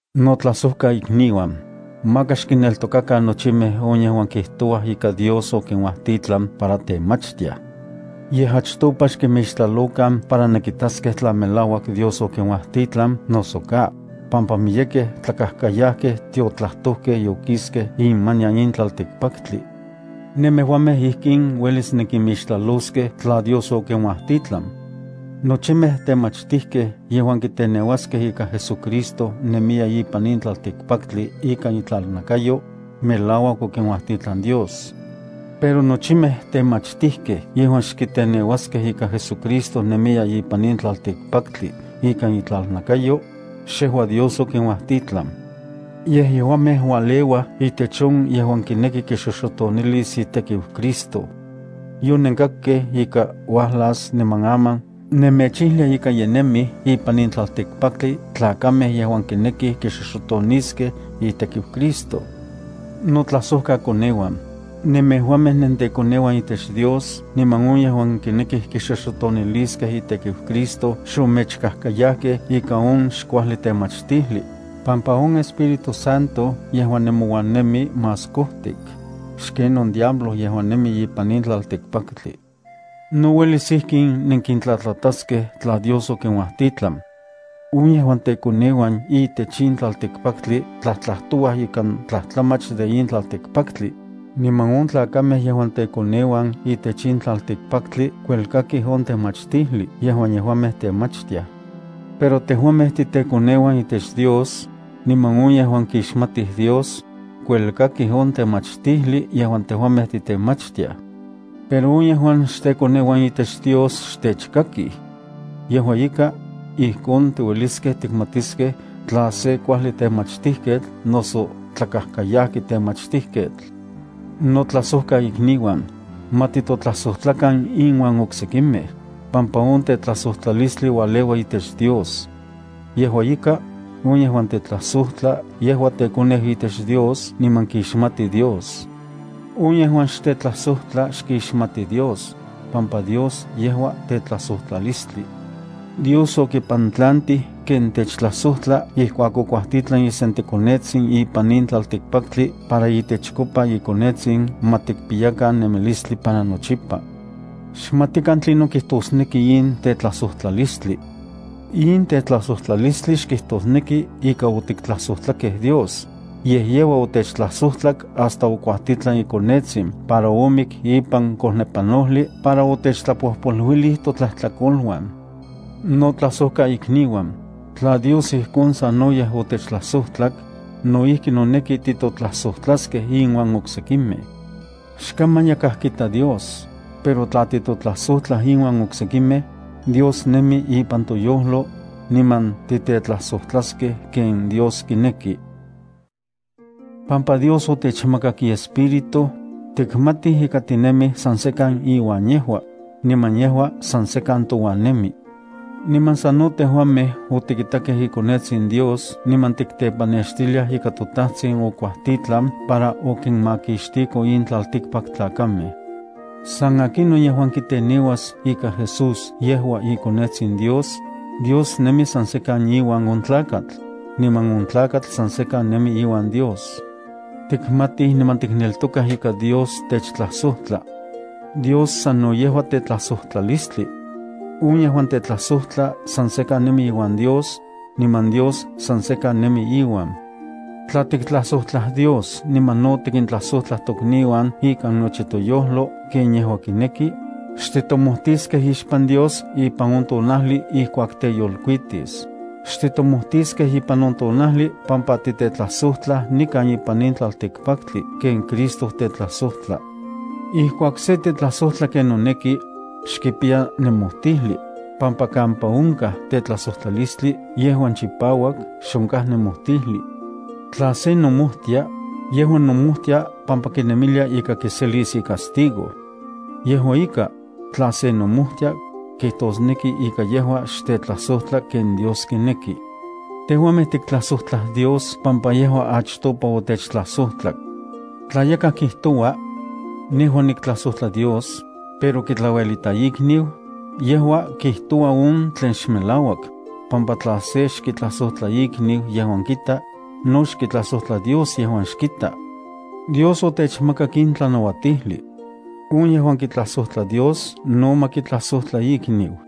Notlajsojkaikniuan, maka xkinneltokakan nochimej on yejuan kijtouaj ika Dios okinuajtitlan para temachtiaj. Yej achtopa xkinmixtlalokan para nenkitaskej tla melauak Dios okinuajtitlan noso ka, pampa miyekej tlakajkayajkej tiotlajtojkej yokiskej imanian in tlaltikpaktli. Nemejuamej ijkin uelis nenkinmixtlaloskej tla Dios okinuajtitlan: nochimej temachtijkej yejuan kiteneuaskej ika JesuCristo nemiya ipan in tlaltikpaktli ikan itlalnakayo, melauak okinuajtitlan Dios. Pero nochimej temachtijkej yejuan xkiteneuaskej ika JesuCristo nemiya ipan in tlaltikpaktli ikan itlalnakayo, xejua Dios okinuajtitlan. Yej yejuamej ualeuaj itech on yejuan kineki kixoxotonilis itekiu Cristo. Yonenkakkej ika uajlas niman aman nemechijlia ika ye nemij ipan in tlaltikpaktli tlakamej yejuan kinekij kixoxotoniskej itekiu Cristo. Notlajsojtlakoneuan, nemejuamej nentekoneuan itech Dios, niman on yejuan kinekij kixoxotoniliskej itekiu Cristo xomechkajkayajkej ikan on xkuajli temachtijli, pampa on Espíritu Santo yejuan nemouan nemi más kojtik xken on diablo yejuan nemi ipan in tlaltikpaktli. No uelis ijkin nenkintlatlataskej tla Dios okinuajtitlan: on yejuan tekoneuan itech in tlaltikpaktli tlajtlajtouaj ikan tlajtlamach de in tlaltikpaktli, niman on tlakamej yejuan tekoneuan itech in tlaltikpaktli kuelkakij on temachtijli yejuan yejuamej temachtiaj. Pero tejuamej titekoneuan itech Dios, niman on yejuan kixmatij Dios, kuelkakij on temachtijli yejuan tejuamej titemachtiaj. Pero on yejuan xtekoneuan itech Dios xtechkakij. Yejua ika, ijkon tiueliskej tikmatiskej tla se kuajli temachtijketl noso tlakajkayajki temachtijketl. Notlajsojkaikniuan, ma titotlajsojtlakan inuan oksekimej, pampa on tetlajsojtlalistli ualeua itech Dios. Yejua ika, on yejuan tetlajsojtla yejua tekoneu itech Dios niman kixmati Dios. On yejuan xtetlajsojtla xkixmati Dios, pampa Dios yejua tetlajsojtlalistli. Dios okipantlantij ken techtlajsojtla ijkuak okuajtitlan isenteKonetsin ipan tlaltikpaktli para itechkopa iKonetsin ma tikpiyakan nemilistli para nochipa. Xmatikan tlinon kijtosneki in tetlajsojtlalistli. In tetlajsojtlalistli xkijtosneki ika otiktlajsojtlakej Dios, yej yejua otechtlajsojtlak hasta okuajtitlan iKonetsin para omik ipan kojnepanojli para otechtlapojpoluilij totlajtlakoluan. Notlajsojkaikniuan, tla Dios ijkon sanoyej otechtlajsojtlak, no ijki noneki titotlajsojtlaskej inuan oksekimej. Xkaman yakaj kita Dios, pero tla titotlajsojtlaj inuan oksekimej, Dios nemi ipan toyojlo, niman titetlajsojtlaskej ken Dios kineki. Pampa Dios otechmakak iEspíritu, tikmatij ika tinemij san sekan iuan yejua, niman yejua san sekan touan nemi. Niman sano tejuamej otikitakej iKonetsin Dios niman tiktepanextiliaj ika toTajtsin okuajtitlan para okinmakixtiko in tlaltikpaktlakamej. San akinon yejuan kiteneuas ika Jesús yejua iKonetsin Dios, Dios nemi san sekan iuan on tlakatl, niman on tlakatl san sekan nemi iuan Dios. Tikmatij niman tikneltokaj ika Dios techtlajsojtla. Dios sano yejua tetlajsojtlalistli. On yejuan tetlajsojtla san sekan nemi iuan Dios, niman Dios san sekan nemi iuan. Tla tiktlajsojtlaj Dios niman no tikintlajsojtlaj tokniuan ikan nochi toyojlo ken yejua kineki, xtitomojtiskej ixpan Dios ipan on tonajli ijkuak teyolkuitis. Xtitomojtiskej ipan on tonajli pampa titetlajsojtlaj nikan ipan in tlaltikpaktli ken Cristo tetlajsojtla. Ijkuak se tetlajsojtla ken noneki, xkipiya nemojtijli, pampa kampa onkaj tetlajsojtlalistli yejuan chipauak xonkaj nemojtijli. Tla se nomojtia, yejua nomojtia pampa kinemilia ika kiselis icastigo. Yejua ika, tla se nomojtia, kijtosneki ika yejua xtetlajsojtla ken Dios kineki. Tejuamej tiktlajsojtlaj Dios pampa yejua achtopa otechtlajsojtlak. Tla yakaj kijtoua: “Nejua niktlajsojtla Dios”, pero kitlauelita ikniu, yejua kijtoua on tlen xmelauak, pampa tla se xkitlajsojtla ikniu yejuan kita, no xkitlajsojtla Dios yejuan xkita. Dios otechmakak in tlanauatijli: On yejuan kitlajsojtla Dios no ma kitlajsojtla ikniu.